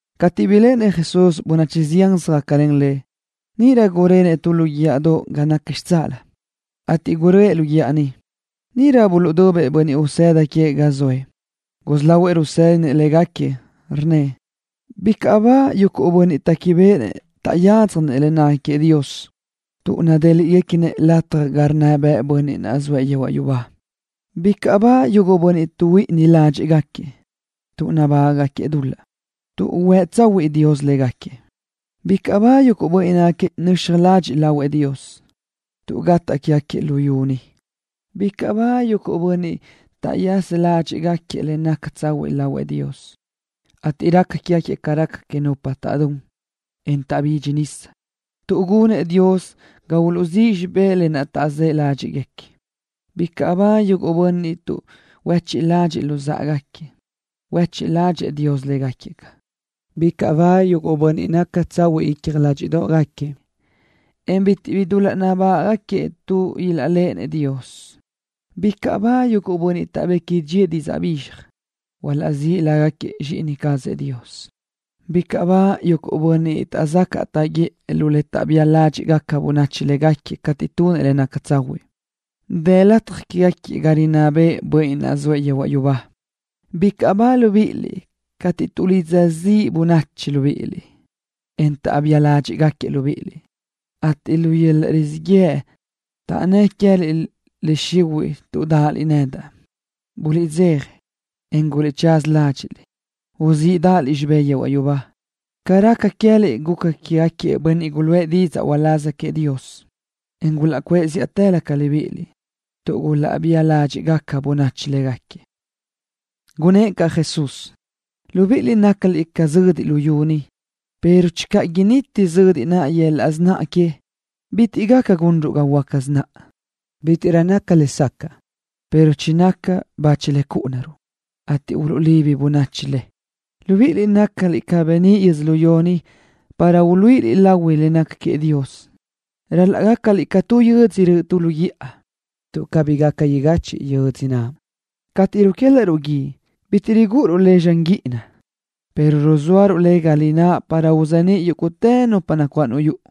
Cateʼ biléʼenëʼ Jesús bönachi zián söjácalen Lëʼ, níʼirö gurenëʼ tu lu guíʼadoʼ ga naca xitsáʼalö, ateʼ guröʼë lu guíʼa niʼ. Níʼirö buluʼdubëʼ bönniʼ usëda queëʼ ga zoëʼ. Gusí lahuëʼ rusédinëʼ légaquiëʼ, rnnëʼ: —Bicaʼ ba yuguʼ bönniʼ téquibeʼenëʼ taʼyádzjanëʼ le naca queëʼ Dios, tuʼ nadéliʼgaquiëʼ lataj ga rinná bëʼë Bönniʼ naʼ zoëʼ yehuaʼ yubá. ’Bicaʼ ba yuguʼ bönniʼ tuʼhuíʼini ládxiʼgaquiëʼ tuʼ nabágaʼgaquiëʼ dul-laʼ, tuʼ huë tsahuëʼë Dios caz légaquiëʼ. ’Bicaʼ ba yuguʼ bönniʼ nácagaquiëʼ nöxaj ladxiʼ lahuëʼ Dios, tuʼ gataʼ quégaquiëʼ luyú ni. ’Bicaʼ ba yuguʼ bönniʼ taʼzë́ ládxiʼgaquiëʼ le naca tsahuiʼ lahuëʼ Dios, ateʼ raca quégaquiëʼ ca raca quégaca nupa taʼdún, en taʼbidxi nisa, tuʼ gunëʼ Dios ga uluʼziʼë xibé lë naʼ taʼzë́ ládxiʼgaquiëʼ. ’Bicaʼ ba yuguʼ bönniʼ tuʼhuechiʼ ládxiʼgaquiëʼ luzáʼagaquiëʼ, tuʼ huéchiʼ ládxëʼë Dios légaquiëʼ. ’Bicaʼ ba yuguʼ bönniʼ naca tsahuiʼ icja ládxiʼdoʼgaquiëʼ, en bitiʼ bi dul-laʼ nabágaʼgaquiëʼ, tuʼ ilaʼléʼenëʼ Dios. ’Bicaʼ ba yuguʼ bönniʼ taʼbequi dxíëʼ didzaʼ bizxaj, tuʼ ilaʼzíʼ lágaquiëʼ zxíʼini cazëʼ Dios. ’Bicaʼ ba yuguʼ bönniʼ taʼzacaʼ taʼguiʼë lu le taʼbía ládxiʼgaca bönachi légaquiëʼ cateʼ tunëʼ le naca tsahuiʼ, tuʼ dë lataj quégaquiëʼ ga rinná bëʼë Bönniʼ naʼ zoëʼ yehuaʼ yubá. ’Bicaʼ ba libíʼiliʼ cateʼ tuʼlidza bönachi libíʼiliʼ ziʼ, en taʼbía ládxiʼgaquiëʼ libíʼiliʼ, ateʼ lu yöl-laʼ rizíʼ yëʼ taʼnnë́ʼ queë́liʼ le xihuiʼ tuʼ dáʼaliʼ nedaʼ. Buliʼdzeja, en guliʼchaza ládxiʼliʼ, tuʼ uzíʼdaʼaliʼ xibé yehuaʼ yubá. Ca raca queë́liʼ, guca quégaquiëʼ bönniʼ guluʼë didzaʼ uláz queëʼ Dios, en gulaʼcuʼë zíʼatëlö ca libíʼiliʼ, tuʼ gulaʼbía ládxiʼgaca caʼ bönachi légaquiëʼ. Gunnë́ʼ caʼ Jesús: —Libiʼiliʼ nácaliʼ ca zödiʼ luyú ni, pero channö initi zödiʼ naʼ yöl-laʼ sináʼa que, bitiʼ gaca gunruʼ ga huöáca sináʼa. Bítiʼrö naca lesacaʼ, pero chinaca tu le chúʼunaruʼ, ateʼ uluʼlibi bönachi le. ’Libíʼiliʼ nácaliʼ ca beníʼ yödzölió ni para uluíʼiliʼ lahui le naca queëʼ Dios. Ral-laʼ gácaliʼ ca tu yödzö röʼö tu lu guíʼa, tuʼ cabí gaca igachiʼ yödzö naʼ. Cateʼ ruquélaʼruʼ guíʼ, bitiʼ rigúʼuruʼ le tu zxan guíʼina, pero ruzóaruʼ le ga lináʼ para uzeníʼ yúguʼtë nupa nacuáʼ lu yuʼu.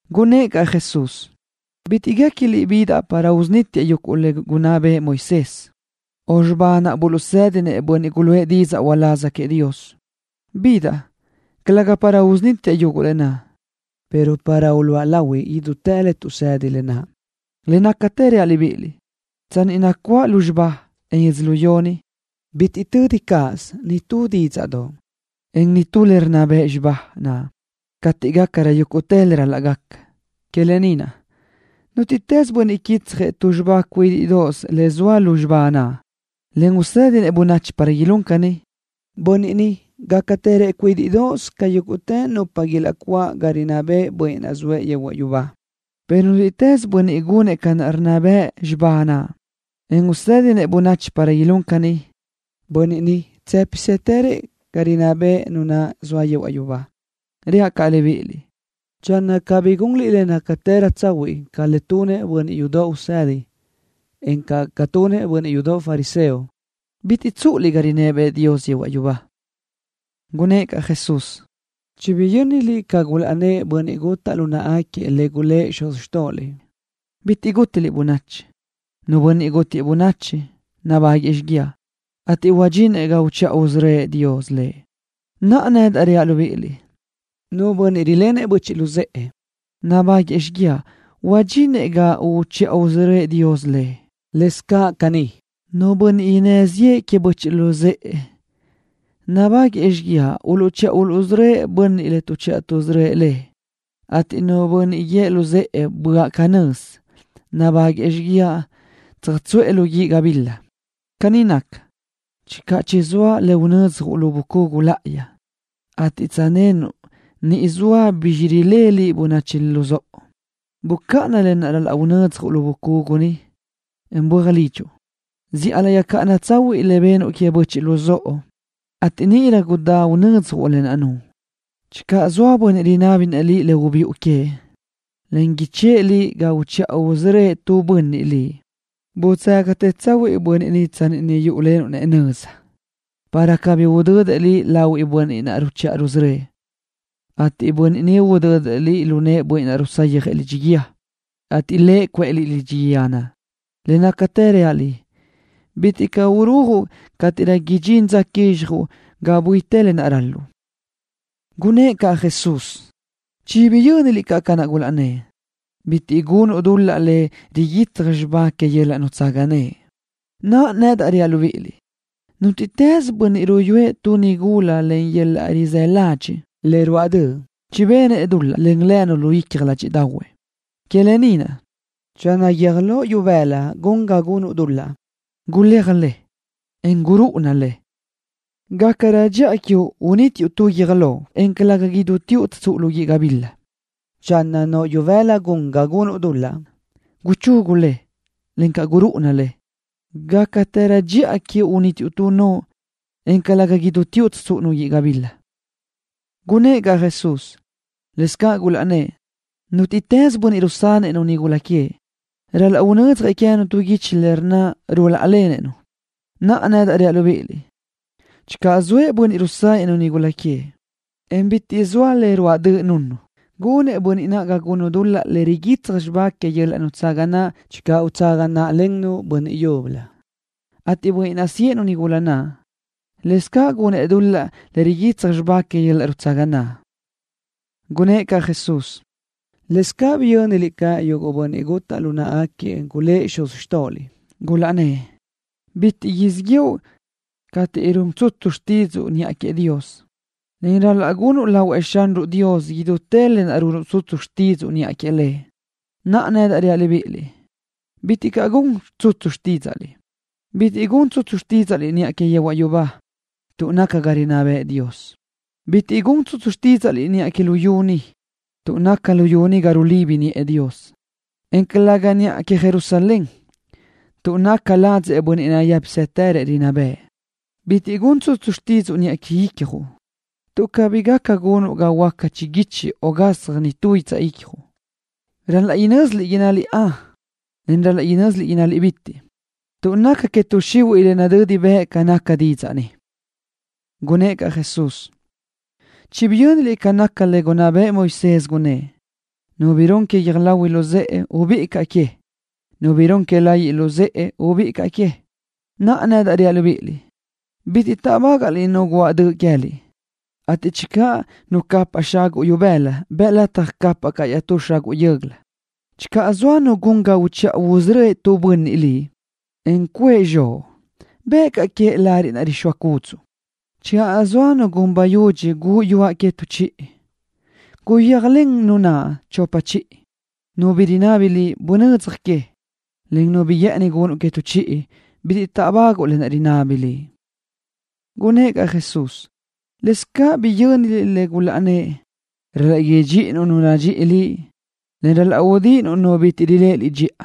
Gunnë́ʼ caʼ Jesús: —Bitiʼ guéquiliʼ bidaʼ para usunítiaʼ yuguʼ le gunná bëʼë Moisés, o xibá naʼ buluʼsédinëʼ bönniʼ guluʼë didzaʼ uláz queëʼ Dios. Bidaʼ, calëga para usunítiaʼ yuguʼ lë naʼ, pero para uluʼa lahui idútë le tuʼsedi lë naʼ. Le nácatë reaʼ libíʼiliʼ. Tsanni nacuáʼ lúzxiba, en yödzölió ni, bitiʼ tödi cáʼasö nitú dídzaʼdoʼ, en nitú le rinná bëʼ xibá naʼ, cateʼ gácarö yúguʼtë le ral-laʼ gaca. Que lë ni naʼ, nútiʼtës bönniʼ quitsjëʼ tu xibá cuídiʼdoʼos le zoa lu xibá naʼ, en usédinëʼ bönachi para ilún caní, bönniʼ ni gácatërëʼ cuídiʼdoʼos ca yúguʼtë nupa ilaʼcuáʼ ga rinná bëʼ Bönniʼ naʼ zoëʼ yehuaʼ yubá, pero nútiʼtës bönniʼ gunëʼ ca rinná bëʼ xibá naʼ, en usédinëʼ bönachi para ilún caʼ caní, bönniʼ ni tsë́pisëtërëʼ ga rinná bëʼ Nu naʼ zoa yehuaʼ yubá. Reaʼ caʼ libíʼiliʼ: Channö cabí gunliʼ le nácatërö tsahuiʼ ca le tunëʼ bönniʼ yudoʼ usedi, encaʼ ca tunëʼ bönniʼ yudoʼ fariseo, bitiʼ caʼ tsúʼuliʼ ga rinná bëʼë Dios yehuaʼ yubá. Gunnë́ʼ caʼ Jesús: —Chibiyö́niliʼ ca gulaʼnnë́ʼ bönniʼ gutaʼ lu náʼagaquiëʼ le gulë́ʼ xuz xtóʼoliʼ: “Bitiʼ gútiliʼ bönachi. Nu bönniʼ gútiëʼ bönachi, nabáguëʼë xíguiaʼ, ateʼ huadxinëʼ ga uchiʼa usörö́ëʼ Dios lëʼ.” Naʼa, nedaʼ reaʼ libíʼiliʼ: Nu bönniʼ rilenëʼ böchiʼ luzë́ʼë, nabáguëʼë xíguiaʼ huadxinëʼ ga uchiʼa usörö́ëʼ Dios lëʼ. Lëscaʼ caní, nu bönniʼ innë́ ziʼë queëʼ böchiʼ luzë́ʼë nabáguëʼë xíguiaʼ uluʼchiʼa uluʼsörö́ëʼ bönniʼ lo tuʼchiʼa tuʼsörö́ëʼ lëʼ, ateʼ nu bönniʼ guíëʼ luzë́ʼë: “¡Böaʼ canö́z!” nabáguëʼë xíguiaʼ tsöjtsuʼë lu guíʼ gabila. ’Caní naca, channö chizóa cuʼu tu le unödzjuʼ lu bucugu láʼayi, ateʼ tsöjnenuʼ niʼ zoa bizx que rilenëʼ böchiʼ luzóʼo liʼ, bucáʼana lë naʼ unödzjuʼ lu bucugu niʼ, en böaj lidxuʼ. Zíʼalö yöjcáʼana tsahuiʼ le benuʼ queëʼ böchiʼ luzóʼo, ateʼ níʼirö gudá unödzjuʼ lë naʼ nuʼu. ’Channö zoa nu bönniʼ rinábinëʼ liʼ bi ubiʼu queëʼ, en ichë́ʼë liʼ ga uchiʼa usörö́ëʼ tu bönniʼ liʼ, budzágatë tsahuiʼ bönniʼ naʼ tsanni niʼ yúʼulenuʼ lëʼ nöza, para cabí udödëʼ liʼ lahuëʼ bönniʼ ruchiʼa rusörö́ëʼ, ateʼ bönniʼ ni udödëʼ liʼ lu nëʼë bönniʼ rusayjëʼ lidxi guíë, ateʼ lëʼ cuʼë liʼ lidxi guíë naʼ. Le nácatë reaʼ liʼ, bitiʼ caʼ urujuʼ niʼ cateʼ idxinrö dza quizxjuʼ ga buitë le ral-luʼu. Gunnë́ʼ caʼ Jesús: —Chibiyö́niliʼ ca naʼ gulaʼnnë́ʼ: “Bitiʼ gunuʼ dul-laʼ le riguitsaj xibá que yöl-laʼ nutsaga naʼ.” Naʼa, nedaʼ reaʼ libíʼiliʼ: Nútiʼtës bönniʼ ruyúëʼ tu nigula len yöl-laʼ rizë́ ladxiʼ le ruáʼ döʼ, chibenëʼ dul-laʼ len lënu lu icja ládxiʼdaʼahuëʼ. ’Que lë ni naʼ, channö guiö́j loʼ ibëla gun ga gunuʼ dul-laʼ, guléaj le, en gurúʼuna le. Gácarö dxiʼa quiuʼ unítiuʼ tu guiö́j loʼ, en calëga idúteoʼ tsöjtsúʼu lu guíʼ gabila. Channö noʼo ibëla gun ga gunuʼ dul-laʼ, guchugu le, en gurúʼuna le. Gácarö dxiʼa quiuʼ unítiuʼ tu noʼo, en calëga idúteoʼ tsöjtsúʼu lu guíʼ gabila. Gunnë́ʼ caʼ Jesús: —Lëscaʼ gulaʼnnë́ʼ: “Nútiʼtës bönniʼ rusanëʼ-nu nigula queëʼ, ral-laʼ unödzjëʼ queë́nu tu guichi le rnna ruláʼalenëʼ-nu.” Naʼa, nedaʼ reaʼ libíʼiliʼ, channö zoëʼ nu bönniʼ rusanëʼ-nu nigula queëʼ, en bitiʼ zoa le ruáʼ döʼ runnu, gunëʼ bönniʼ naʼ ga gunnu dul-laʼ le riguitsaj xibá que yöl-laʼ nutsaga naʼ channö utsaga náʼlennu bönniʼ yúbölö, ateʼ bönniʼ naʼ siʼë-nu nigula naʼ, lëscaʼ gunëʼ dul-laʼ le riguitsaj xibá que yöl-laʼ nutsaga naʼ. Gunnë́ʼ caʼ Jesús: —Lëscaʼ biyö́niliʼ ca yuguʼ bönniʼ gutaʼ lu náʼagaquiëʼ gulë́ʼ xuz xtóʼoliʼ, gulaʼnnë́ʼ: “Bitiʼ siʼ yëʼu cateʼ run tsutsu xtídzuʼu niʼa queëʼ Dios, en ral-laʼ gunuʼ lahuëʼ Xanruʼ Dios idútë lë naʼ run tsutsu xtídzuʼu niʼa queëʼ Lëʼ.” Naʼa, nedaʼ reaʼ libíʼiliʼ, bitiʼ caʼ gun tsutsu xtídzaʼliʼ. Bitiʼ gun tsutsu xtídzaʼliʼ niʼa que yehuaʼ yubá, tuʼ naca ga röʼë rinná bëʼë Dios. Bitiʼ gun tsutsu xtídzaʼliʼ niʼa que luyú ni, tuʼ naca luyú ni ca xilibi niʼë Dios, en calëga niʼa que Jerusalén, tuʼ naca ladzëʼ Bönniʼ nayë́pisëtërëʼ rinná bëʼë. Bitiʼ gun tsutsu xtídzuʼu niʼa que icjuʼ, tuʼ cabí gaca gunuʼ ga huöáca chiguichi o gasaj nitú guitsaʼ icjuʼ. Ral-laʼ innásiliʼ: “Ön”, o innásiliʼ: “Bitiʼ”, tuʼ naca que tuʼ xihuiʼ le nadödi bëʼ ca nácagaca didzaʼ ni. Gunnë́ʼ caʼ Jesús: —Chibiyö́niliʼ ca naca le gunná bëʼë Moisés, gunnë́ʼ: “Nu bi run que guiö́j lahui luzë́ʼe, ubíʼi caʼ que, encaʼ nu bi run que layiʼ luzë́ʼe, ubíʼi caʼ que.” Naʼa, nedaʼ reaʼ libíʼiliʼ: Bitiʼ táʼbagaʼliʼ nu guáʼ döʼ queë́liʼ, ateʼ channö nu capaʼ xaguʼ ibëla, bëʼ lataj capaʼ caʼ iaʼtú xaguʼ yö́göla. Channö zoa nu gun ga uchiʼa usörö́ëʼ tu bönniʼ liʼ, en cuëʼ zxoʼ, bëʼ caʼ queëʼ lariʼ rixóa cúdzuʼu. Channö zoa nu gun bayudxi guʼu yuaʼ que tu chiʼi, guyéajlen nu naʼ chopa chiʼi. Nu bi rinábini liʼ, bunödzaj que, en nu bi guë́ʼëni gunnuʼ que tu chiʼi, bitiʼ táʼbaguʼu lë naʼ inabi liʼ. Gunnë́ʼ caʼ Jesús: —Lëscaʼ caní biyö́niliʼ lë naʼ gulaʼnnë́ʼ: “Ral-laʼ idxíʼinuʼ nu nadxíʼi liʼ, en udíʼinuʼ nu bitiʼ riléʼe liʼ dxiʼa.”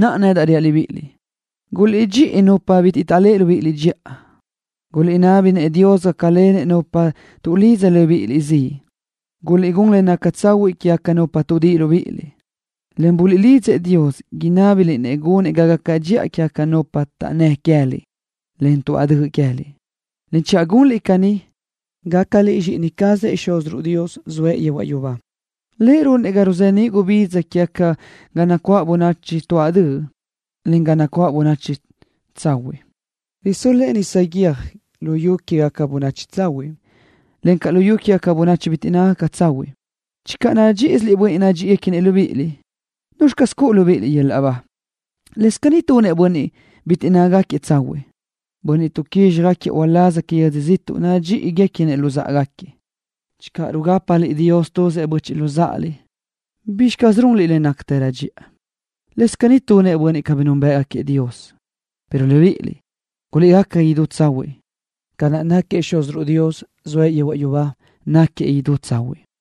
Naʼa, nedaʼ reaʼ libíʼiliʼ, guliʼdxíʼi nupa bitiʼ taʼléʼe libíʼiliʼ dxiʼa. Guliʼnábinëʼ Dios gácalenëʼ nupa tuʼlidza libíʼiliʼ ziʼ. Guliʼgún le naca tsahuiʼ quégaca nupa tuʼdíʼi libíʼiliʼ, en buliʼlidzëʼ Dios inábiliʼ-nëʼ gunëʼ ga gaca dxiʼa quégaca nupa taʼnnë́ queë́liʼ, en tuáʼ döʼ queë́liʼ. Channö gunliʼ caní, gácaliʼ zxíʼini cazëʼ Xúziruʼ Dios, zoëʼ yehuaʼ yubá, tuʼ runëʼ Lëʼ ga ruzeníʼ gubidza queëʼ ga nacuáʼ bönachi tuáʼ döʼ, encaʼ ga nacuáʼ bönachi tsahuiʼ. Risö́l-lëʼë tu nisa guiö́j lu yu quégaca bönachi tsahuiʼ, encaʼ lu yu quégaca bönachi bitiʼ nácagaca tsahuiʼ. Channö nadxíʼisiliʼ bönniʼ nadxíʼiguequinëʼ libíʼiliʼ, ¿nuzxi caz cuʼu libíʼiliʼ yöl-laʼ ba? Lëscaʼ caní tunëʼ bönniʼ bitiʼ nácagaca tsahuiʼ naʼ, bönniʼ tuʼquizxjëʼ uláz que yödzö ziʼtuʼ, nadxíʼiguequinëʼ luzáʼagaquiëʼ. Channö rugápaliʼ Dios tuzëʼ böchiʼ luzáʼaliʼ, ¿bizxi caz runliʼ le nácatërö dxiʼa? Lëscaʼ caní tunëʼ bönniʼ bitiʼ núnbëʼgaquiëʼ Dios. Pero libíʼiliʼ, guliʼgaca idú tsahuiʼ, ca naʼ náquiëʼ Xúziruʼ Dios, zoëʼ yehuaʼ yubá, náquiëʼ idú tsahuiʼ.